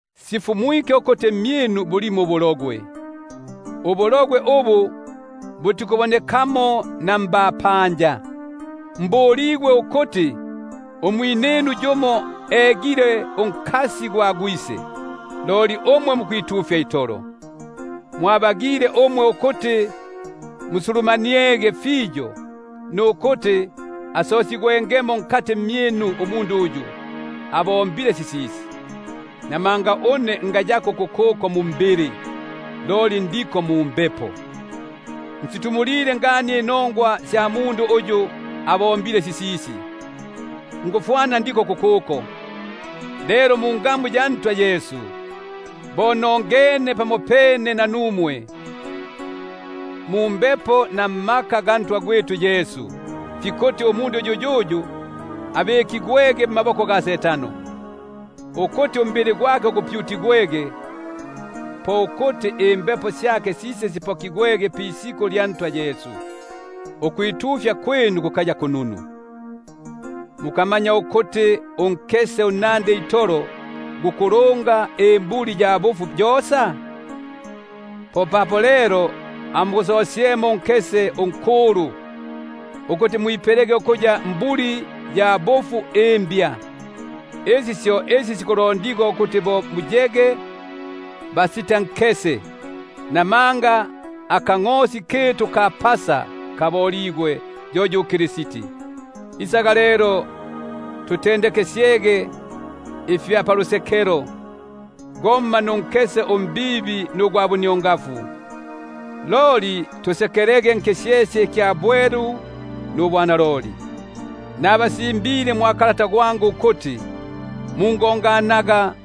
Sifumwike ukuti mmyinu bulimo ubuhahani, ubuhahani ubu butikubonekamo na mbapanja; ubwa kuti yumo egile unkasi gwa gwise. Loli umwe mukwiyumbika itolo, kali mukabagile ukuti musulumaniege fiyo, ukuti asosigwemo nkati mmyinu umundu uyu abombile sisisi? Namanga une ngayako kukuko umbili, loli ndiko mu mumbepo; nsitumulile ngani inongwa sya mundu uyu abombile sisisi, ngufwana ndi kukuko itolo. Lelo mungamu ya Ntwa Yesu, bo nongene pamopene nanumwe mumbepo namaka ga Ntwa gwitu Yesu, fikuti umundu yuyuyu abikigwege mmaboko ga Setano, ukuti umbili gwake gupyutigwege; ko kuti imbepo syake sise sipokigwege pisiku lya Ntwa Yesu. Ukwitufya kwinu kukaya kununu. Mukamanya ukuti unkese unnandi itolo gukulunga imbuli#imbuli, bamo bikuti imbulumbwa. yosa? Popapo lelo amugusosyepo unkese unkulu, ukuti mwipelege ukuya mbuli imbya, bo apa muli basitankese. Namanga akangʼosi kitu ka Pasa kaboligwe, yo yu Kristi. Isaga lelo tusekelege, momma munkese unkulu, momma na munkese umbibi nugwa buniongafu; loli tusekelege nkisyesye ikisitankese ikya bwelu nubwa naloli. Nabasimbile mwa kalata gwangu ukuti mungonganaga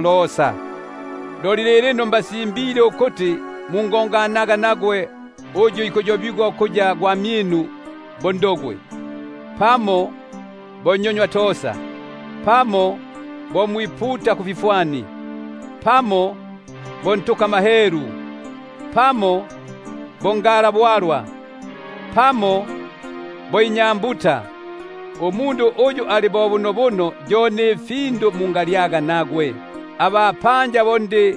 losa. Loli lilino mbasimbile ukuti mungonganaga nagwe uyu ikuyobigwa ukuya gwamyinu, bo nhahani, pamo nnyonywatosa, pamo mwiputa kufifwani, pamo ntukamahelu, pamo ngalabwalwa, pamo inyambuta, — uyu ali bo bunobuno yo na fi findu mungalyaga nagwe. Abapanja bo ndi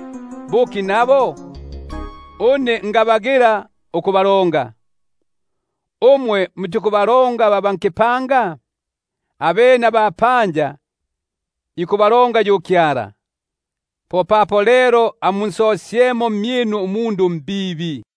buki nabo ukubalonga? Umwe mutikubalonga ba ba nkipanga? Abene abapanja bo ikubalonga yu Kyala. Popapo lelo amunsosyemo mmyinu umundu umbibi uyu.